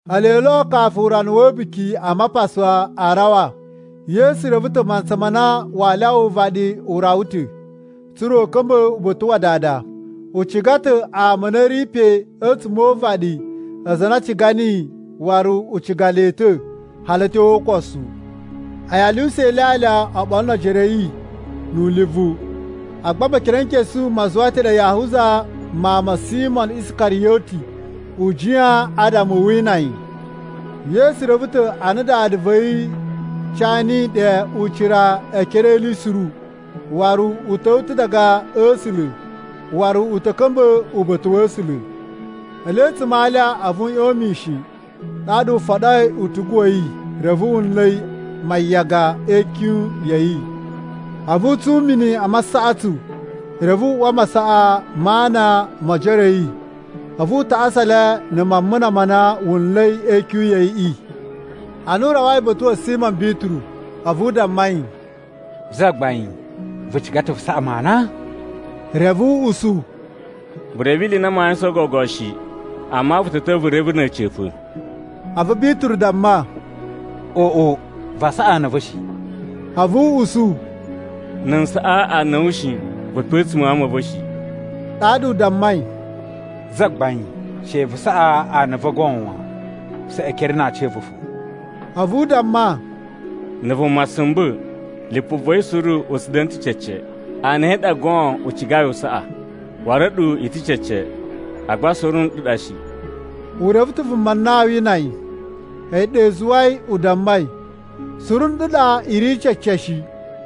Ele lo kafu urana wa̱ A̱buki a Mapasa a rawa, Yesu reve ta̱ mantsa ma na waa lyawa uvaɗi u rawa ta̱, tsa̱ra̱ u ka̱mba̱ uba̱ta̱ wa Dada. U ciga ta̱ ama a na a̱ ri pe a̱tsuma̱ o uvaɗi aza a na a ciga niyi, waru u ciga le ta̱ hali a̱ tyo o ukosu. A̱yi a lyuwusa ilyalya oɓolo no ojoro a̱ yi nu ulivu, agba Mekerenkesu ma zuwa ta̱ ɗe Yahuza, mawun ma̱ Simo Iskariyoti, u jiyan adama u wina yi. Yesu reve ta̱ a na Dada va̱ yi ca niyi ɗe ucira e ekere e ili suru, waru u ta̱wa̱ ta̱ diga a̱ A̱sula̱, waru u ta̱ ka̱mba̱ uba̱ta̱ wa̱ A̱sula̱. Ele a̱tsuma̱ a alya, a̱vu u ꞌyon mishin ɗaɗa u foɗoi utugu wa̱ yi reve wu nla̱ mayaga e ikyun ya̱ yi. A̱vu u tsun mini a masaꞌatsu reve u uwa masaꞌa ma ana mo ojoro a̱ yi, a̱vu u tasa le na̱ mamuna ma na wu nla̱i e ikyun ya̱ yiꞌi. Ana u rawai uba̱ta̱ wa̱ Simo Bituru, a̱vu u damma yi, “Zagbain, vu ciga ta̱ vu saꞌa mu ana?” Reve u usu, “Vu reve ili i na maa yuwusan gogo shi, amma vu ta̱ ta̱wa̱ vu reve na̱ a̱ca̱pa̱.” A̱vu Bituru damma, “Oꞌo, vaa saꞌa ana a̱ va̱ shi.” A̱vu u usu, “Na̱ n saꞌa ana a̱ wu shi, vu pe a̱tsuma̱ a ama a̱ va̱ shi.” Ɗaɗa u dammai, “Zagbain, she vu saꞌa ana a̱ va̱ goon wan! Saꞌa ekere na aaci a̱ va̱ fo!” A̱vu u damma, “Na̱ vuma sumba̱, lipu va̱ yi suru u tsu da̱na̱ ta̱ cece. Ana a̱ yi a ɗa goon u cigai u saꞌa. Waru a̱ɗu i ta̱ cece, agba suru nɗu ɗa shi.” U reve ta̱ vuma na aa wina yi, a̱yi ɗa i zuwai u dammai, “Suru nɗu ɗa i ri cece shi.”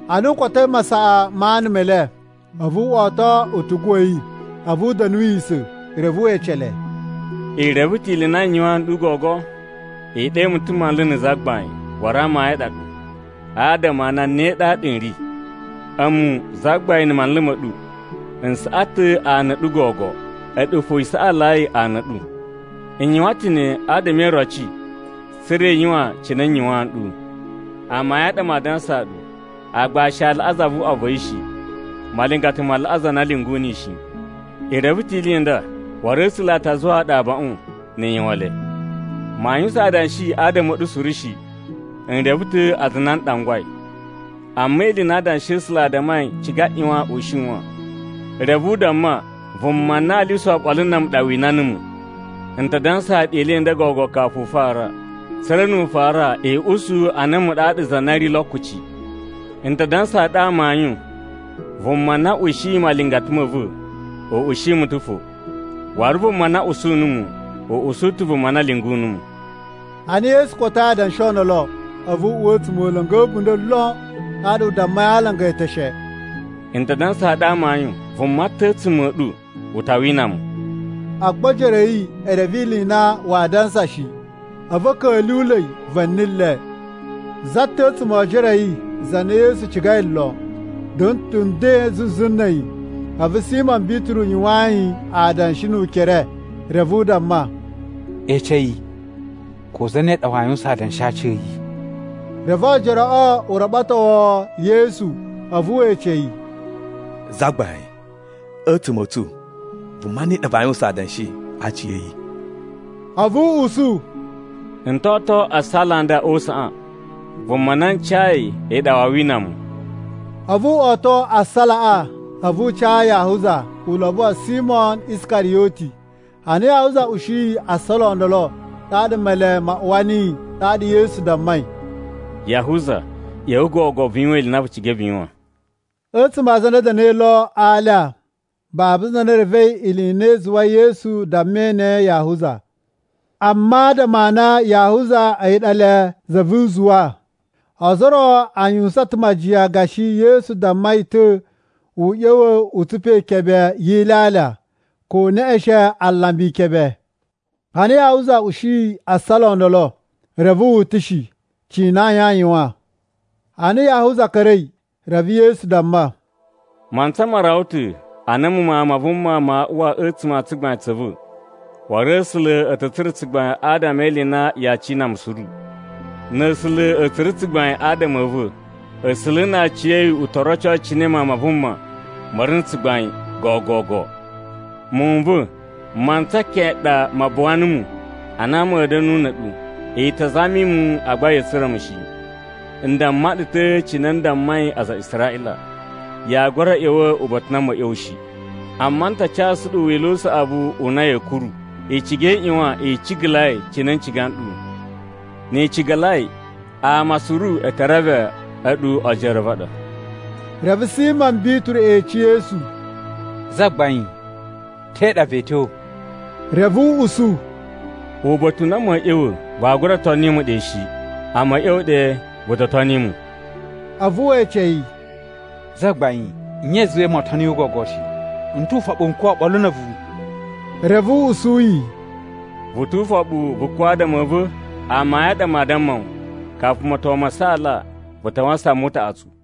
Ana u kotoi masaꞌa ma ana me le, a̱vu wo oto utugu wa̱ yi. A̱vu u da̱nuwisa̱, reve we ece le, “I reve ta̱ ili i na n yuwaan nɗu gogo? I ɗe mu ta̱ ‘Manlu’ na̱ ‘Zagbain’ waru amayun a ɗa ɗu, adama a na ne ɗaɗa n ri. A̱mu, Zagbain na̱ Manlu ma̱ ɗu, n saꞌa ta̱ ana a̱ ɗu gogo. A̱ɗu fo i saꞌalai ana a̱ ɗu. N yuwan ta̱ ne adama e iroci tsa̱ra̱ i yuwan cine n yuwaan nɗu. Amayun a ɗa maa dansaa ɗu, aagbashi a laꞌa zavuꞌwa va̱ yi shi. Malingata ma laꞌa za na lyungu niyi shi. I reve ta̱ ili i nda, waru A̱sula̱ a ta zuwaa ɗu abaꞌun, ni i yuwan le. “Maa yuwusan adanshi adama a̱ ɗu suru shi. N reve ta̱ aza a na n ɗangwai. Amma ili i na Adanshi a̱ A̱sula̱ a dammai ciga ꞌyuwan u shiwan. Reve u damma, ‘Vuma na aa lyuwusa oɓolo na̱ a̱mu ɗa wina numu!’ “N ta dansaa ɗu ili i nda gogo kafu u fara, tsa̱ra̱ nu u fara, i usu a na a̱mu ɗaɗa za na ri lo kuci. N ta dansaa ɗu amayun, vuma na ushiyi malingata ma̱ va̱, u ushi mu ta̱ fo. Waru vuma na usu numu, u usu ta̱ vuma na lyungu numu.” Ana Yesu kotoi adanshi o ndolo, a̱vu u uwa a̱tsumola̱ngu a̱ a̱bunda̱ lon. Ɗaɗa u dammai a alanga e eteshe, “N ta dansaa ɗu amayun, vuma ta̱ a̱tsuma̱ a̱ ɗu u ta wina mu.” Agba ojoro a̱ yi e reve ili i na waa dansa shi. A̱vu a̱ ka̱lyuwula̱i va̱ni le. Za ta̱ a̱tsuma̱ o ojoro a̱ yi za na Yesu cigai lon, da̱na̱ ta̱ nden zuzu na̱ a̱yi. A̱vu Simo Bituru yuwaan yi adanshi nu ukere reve u damma, “Ece yi ko zane ɗa waa yuwusan adanshi a aci a̱ yi.” Reve oojoroꞌo u raɓatowo Yesu, a̱vu we ece yi, “Zagbain, a̱tsuma̱ a̱ tsu, vuma ne ɗa vaa yuwusan adanshi a aci a̱ yi?” A̱vu u usu, “N to oto assala a nda o usaꞌan. Vuma na n cayi a̱yi ɗa waa wina mu.” A̱vu wo oto assalaꞌa a̱vu u ca Yahuza, ulobo wa̱ Simo Iskariyoti. Ana Yahuza ushiyi assala o ndolo, ɗaɗa Male ma uwa niyi. Ɗaɗa Yesu dammai, “Yahuza, ꞌya̱wa̱ gogo vu yuwan ili i na vu cigai vu yuwan.” A̱tsuma̱ a aza a na a̱ da̱na̱i lo a alya, babu za na revei ili i na i zuwai Yesu dammai ne Yahuza. Amma adama a na Yahuza a̱yi ɗa le za vu uzuwa, ozo o ro a yuwusan ta̱ majiyan gashi Yesu damma yi ta̱, u ꞌya̱wa̱ u tsupa ikebe yi ilyalya, ko u neꞌeshen alambi ikebe. Ana Yahuza ushiyi assala o ndolo, reve wu utushi, cina ayin a yuwan. Ana Yahuza ka̱ra̱i, reve Yesu damma, “Mantsa ma rawa ta̱ a na a̱mu Mawun ma Vuma maa uwa a̱tsuma̱ a tsugbain tsa̱ va̱, waru A̱sula̱ a̱ ta̱ tsura̱ tsugbain adama e ili i na yaa cina mu suru. Na̱ A̱sula̱ a̱ tsura̱ tsugbain adama a̱ va̱, A̱sula̱ na aciya̱yi u to roco cine Mawun ma Vuma ma̱ ri na̱ tsugbain gogogo. “Muwun n va̱, mantsa keꞌen ɗa ma buwa numu a na ma̱a̱ da̱nu na̱ a̱ɗu. I ta zami mu, agba ya̱a̱ tsura̱ mu shi. N damma ɗu ta̱ cine n dammai aza a Israꞌila, ‘Yaa gura ꞌya̱wa̱ uba̱ta̱ u na ma̱a̱ ꞌya̱wa̱ shi.’ “Amma n ta casu ɗu wila̱ u saꞌavu u na ya̱a̱ kuru. I ciga i ꞌyuwan i cigalai cine n ciga nɗu. Ni i cigalai, ama suru e te reve a̱ɗu ojoro a̱ va̱ a ɗa.” Reve Simo Bituru ece Yesu, “Zagbain, te ɗa vee tyo?” Reve u usu, “Uba̱ta̱ u na ma̱a̱ ꞌya̱wa̱ vaa gura toni mu ɗe shi, amma a̱ ꞌya̱wa̱ ɗe vu to toni mu.” A̱vu we ece yi, “Zagbain, nye i zuwai moo toni wu gogo shi? N tu ufoɓu n kuwa̱ oɓolo na̱ a̱vu!” Reve u usu yi, “Vu tu ufoɓu vu kuwa̱ adama a̱ va̱? Amayun a ɗa maa damma wu, kafu moton ma saala, vu ta wasan mu utaꞌatsu.”